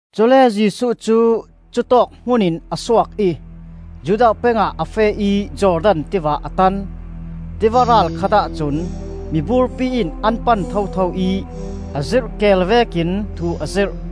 Cule Jesuh cu cutawk hmun in a suak ih Judea peng ah a feh ih Jordan Tiva a tan. Tiva ral khat ahcun miburpi in an pan thotho ih a zirh keel vekin thu a zirh.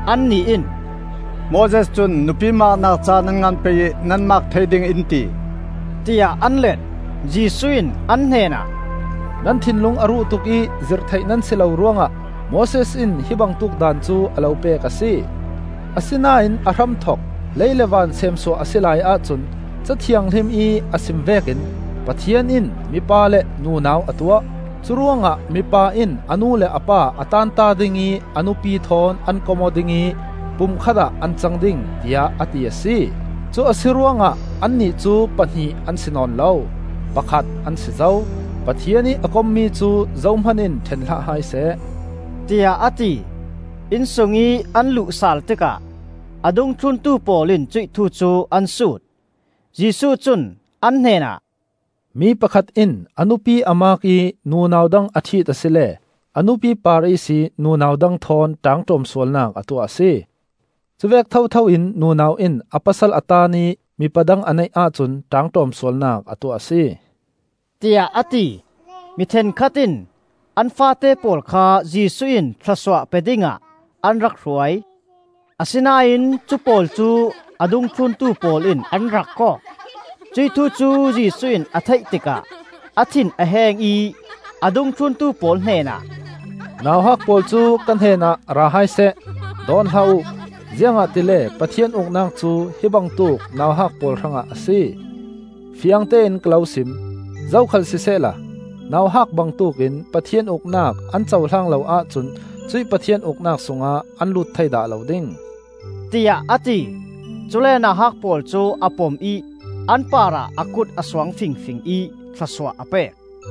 Annih in, “Moses cun nupi maaknak ca nan ngan pei ih nan maak thei ding in ti,” tiah an let. Jesuh in an hnenah, “Nan thinlung a ruh tuk ih zirh theih nan si lo ruangah Moses in hi bangtuk daan cu a lo pek a si. Asinain a hramthok, lei le van seemsuah a si laiah cun Ca Thianghlim ih a sim vekin ‘Pathian in mipa le nunau a tuah. Curuangah mipa in a nu le a pa a taanta ding ih a nupi thawn an kom aw ding ih pumkhat ah an cang ding,’ tiah a ti a si. Cu a si ruangah annih cu pahnih an si nawn lo, pakhat an si zo. Pathian ih a kommi cu zohman in ṭhen hlah hai seh,” tiah a ti. Inn sungih an luh sal tikah a dungthluntu pawl in cuih thu cu an sut. Jesuh cun an hnenah, “Mi pakhat in a nupi a maak ih nunau dang a ṭhit asile a nupi par ihsih nunau dang thawn ṭaangṭawm sualnak a tuah a si. Cuvek thotho in nunau in a pasal a taan ih mipa dang a neih ahcun ṭaangṭawm sualnak a tuah a si,” tiah a ti. Mi ṭhenkhat in an faate pawl kha Jesuh in thlawsuah pe dingah an rak hruai. Asinain cu pawl cu a dungthluntu pawl in an rak kawk. Cuih thu cu Jesuh ih a theih tikah a thin a heng ih a dungthluntu pawl hnenah, “Nauhak pawl cu ka hnenah ra hai seh, dawn hlah uh. Ziangahtile Pathian Uknak cu hi bangtuk nauhak pawl hrangah a si. Fiangtein ka lo sim: zokhal sisehla nauhak bangtuk in Pathian Uknak an cohlang lo ahcun cuih Pathian Uknak sungah an lut thei dah lo ding,” tiah a ti. Cule nauhak pawl cu a pom ih an parah a kut a suang fingfing ih thlawsuah a pek.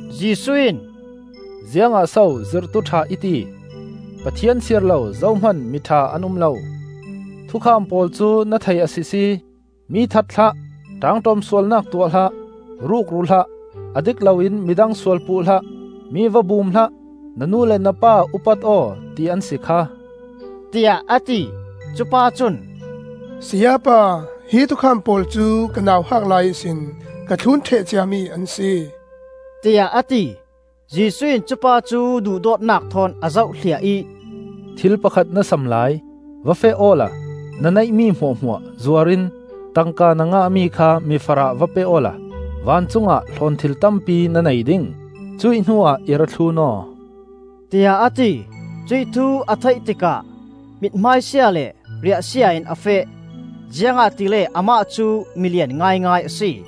Jesuh in, “Ziangah so zirhtu ṭha i ti? Pathian siar lo zohman mi ṭha an um lo. Thukham pawl cu na thei a sisi. ‘Mi that hlah; ṭaangṭawm sualnak tuah hlah; rukru hlah; a dik loin midang sual puh hlah; mi va bum hlah; na nu le na pa upat aw,’ ti an si kha,” tiah a ti. Cupa cun, “Sayapa, hi thukham pawl cu ka nauhak lai ihsin ka thlun ṭheh ciami an si,” tiah a ti. Jesuh in cupa cu duhdawtnak thawn a zoh hliah ih, “Thil pakhat na sam lai. Va feh awla na neihmi hmuahhmuah zuar in tangka na ngah mi kha mifarah va pe awla vancung ah hlawnthil tampi na nei ding. Cuih hnuah i ra thlun aw,” tiah a ti. Cuih thu a theih tikah mithmai sia le riahsia in a feh; ziangahtile amah cu milian ngaingai a si.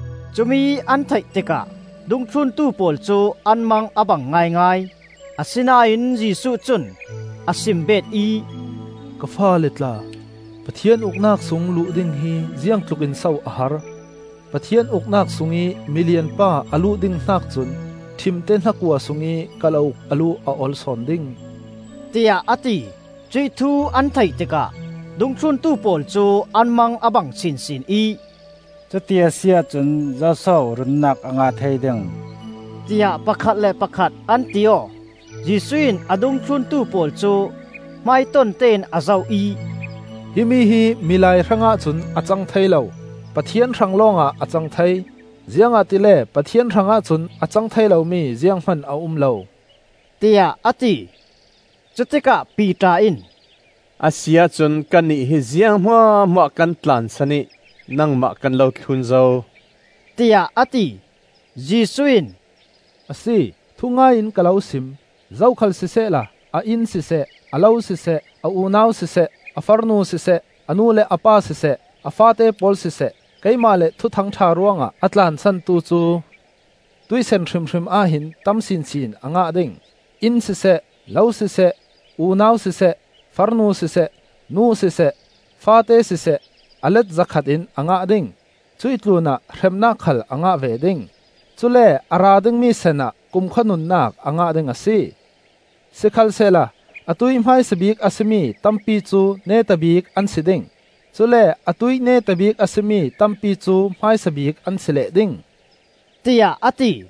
Cumi an theih tikah dungthluntu pawl cu an mang a bang ngaingai; asinain Jesuh cun a sim beet ih, “Ka faale tla, Pathian Uknak sung luh ding hi ziangtlukin so a har! “Pathian Uknak sungih milian pa a luh ding hnak cun ṭhimte hnakua sungih kalauk a luh a ol sawn ding,” tiah a ti. Cuih thu an theih tikah dungthluntu pawl cu an mang a bang sinsin ih, “Cuti a si ahcun zoso runnak a ngah thei ding?” tiah pakhat le pakhat an ti aw. Jesuh in a dungthluntu pawl cu hmaiton tein a zoh ih, “Himi hi milai hrangah cun a cang thei lo; Pathian hrang lawngah a cang thei. Ziangahtile Pathian hrangah cun a cang thei lomi zianghman a um lo,” tiah a ti. Cutikah Piter in, “A si ahcun kannih hi ziang hmuahhmuah kan tlansan ih nangmah kan lo thlun zo,” tiah a ti. Jesuh in, “A si, thungai in ka lo sim: zokhal sisehla a inn siseh, a lo siseh, a unau siseh, a farnu siseh, a nu le a pa siseh, a faate pawl siseh, keimah le Thuthang ṭha ruangah a tlansantu cu, tuihsan hrimhrim ah hin tam sinsin a ngah ding. Inn siseh, lo siseh, unau siseh, farnu siseh, nu siseh, faate siseh, a let zakhat in a ngah ding; cuih tlunah hremnak khal a ngah ve ding. Cule a ra dingmi sanah kumkhua nunnak a ngah ding a si. Sikhalsehla atuih hmaisa bik a si mi tampi cu neta bik an si ding, cule atuih neta bik a si mi tampi cu hmaisa bik an si leh ding,” tiah a ti.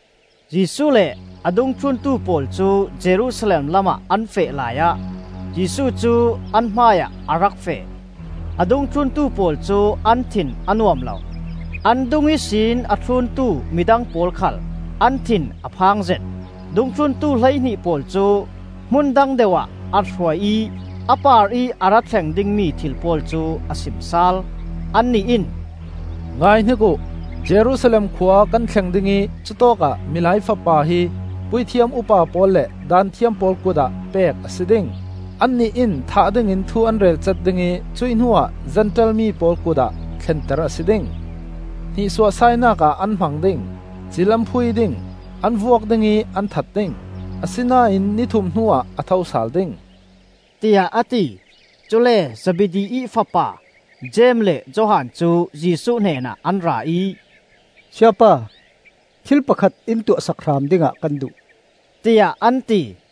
Jesuh le a dungthluntu pawl cu Jerusalem lam ah an feh laiah Jesuh cu an hmaiah a rak feh; a dungthluntu pawl cu an thin a nuam lo. An dung ihsin a thluntu midang pawl khal an thin a phangzet. Dungthluntu hleihnih pawl cu hmun dang deuh ah a hruai ih a parih a ra thleng dingmi thil pawl cu a sim sal. Anih in, “Ngaihnik uh! Jerusalem khua kan thleng ding ih cutawkah Milai Fapa hi puithiam upa pawl le Daanthiam pawl kut ah pek a si ding. Annih in thah dingin thu an relcat ding ih cuih hnuah Zentail mi pawl kut ah thlenter a si ding. Hnihsuahsainak ah an hmang ding, cil an phui ding, an vuak ding ih an that ding. Asinain ni thum hnuah a tho sal ding,” tiah a ti. Cule Zebedi ih fapa Jeim le Johan cu Jesuh hnenah an ra ih “Sayapa, thil pakhat in tuahsak hram dingah kan duh,” tiah an ti.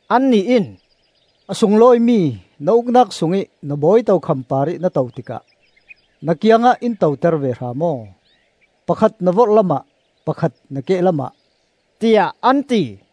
Annih in, “A sunglawimi na Uknak sungih na bawi tokham parih na to tikah na kiangah in toter ve hram aw; pakhat na vorhlam ah, pakhat na kehlam ah,” tiah an ti.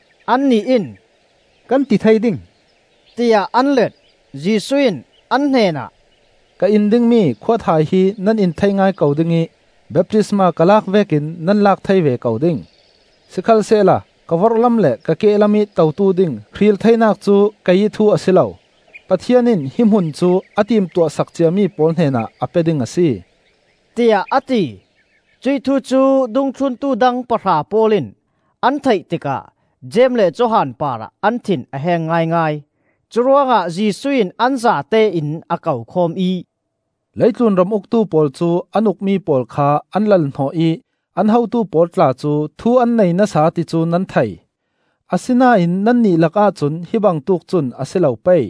Annih in, “Kan ti thei ding,” tiah an let. Jesuh in an hnenah, “Ka in dingmi khuathai hi nan in thei ngai ko ding ih baptisma ka lak vekin nan lak thei ve ko ding. Sikhalsehla ka vorhlam le ka kehlam ih totu ding hril theinak cu keiih thu a si lo. Pathian in hi hmun cu a timtuah sak ciami pawl hnenah a pe ding a si,” tiah a ti. Cuih thu cu dungthluntu dang pahra pawl in an theih tikah Jeim le Johan parah an thin a heng ngaingai. Curuangah Jesuh in an zatein a kokhawm ih, “Leitlun ram uktu pawl cu an ukmi pawl kha an lal-hnawh ih an hotu pawl tla cu thu an nei nasa ti cu nan thei. Asinain nannih lakah cun hi bangtuk cun a si lo pei.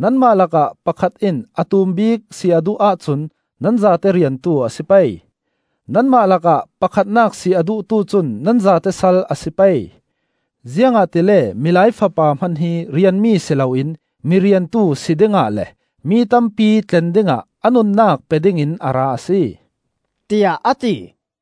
Nanmah lakah pakhat in a tum bik si a duh ahcun nan zate riantu a si pei. Nanmah lakah pakhatnak si a duhtu cun nan zate sal a si pei. Ziangahtile Milai Fapa hman hi rianmi si loin miriantu si dingah le mi tampi tlen dingah a nunnak pe dingin a ra a si,” tiah a ti.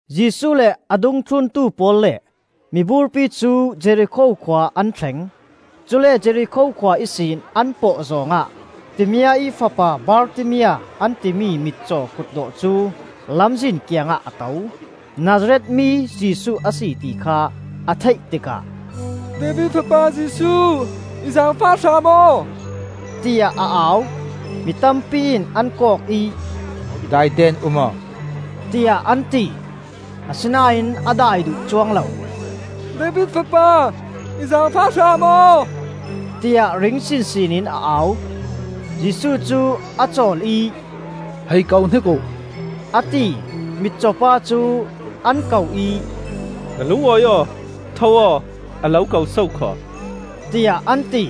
Jesuh le a dungthluntu pawl le miburpi cu Jerikho khua an thleng. Cule Jerikho khua ihsin an pawh zawng ah Timia ih fapa Bartimia an timi mitcaw kutdawh cu lamzin kiangah a to. Nazareth mi Jesuh a si ti kha a theih tikah, “David Fapa Jesuh! I zaangfah hram aw,” tiah a au. Mi tampi in an kawk ih, “Daite in um aw,” tiah an ti. Asinain a dai duh cuang lo. “David Fapa, i zaangfah hram aw,” tiah ring sinsin in a au. Jesuh cu a cawl ih, “Hei ko hnik uh,” a ti. Mitcaw pa cu an ko ih, “Na lung awi aw, tho aw, a lo ko so khaw,” tiah an ti.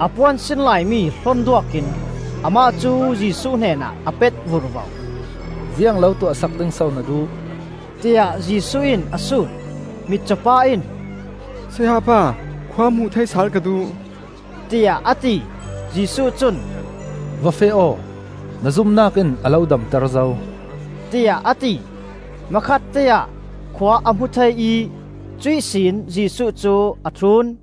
A puan sin laimi hlon duak in amah cu Jesuh hnenah a pet vurvo. “Ziang lo tuah sak ding so na duh?” tiah Jesuh in a sut. Mitcaw pa in, “Sayapa, khua hmuh thei sal ka duh,” tiah a ti. Jesuh cun, “Va feh aw, na zumnak in a lo damter zo,” tiah a ti. Hmakhatteah khua a hmu thei ih cuih sin Jesuh cu a thlun.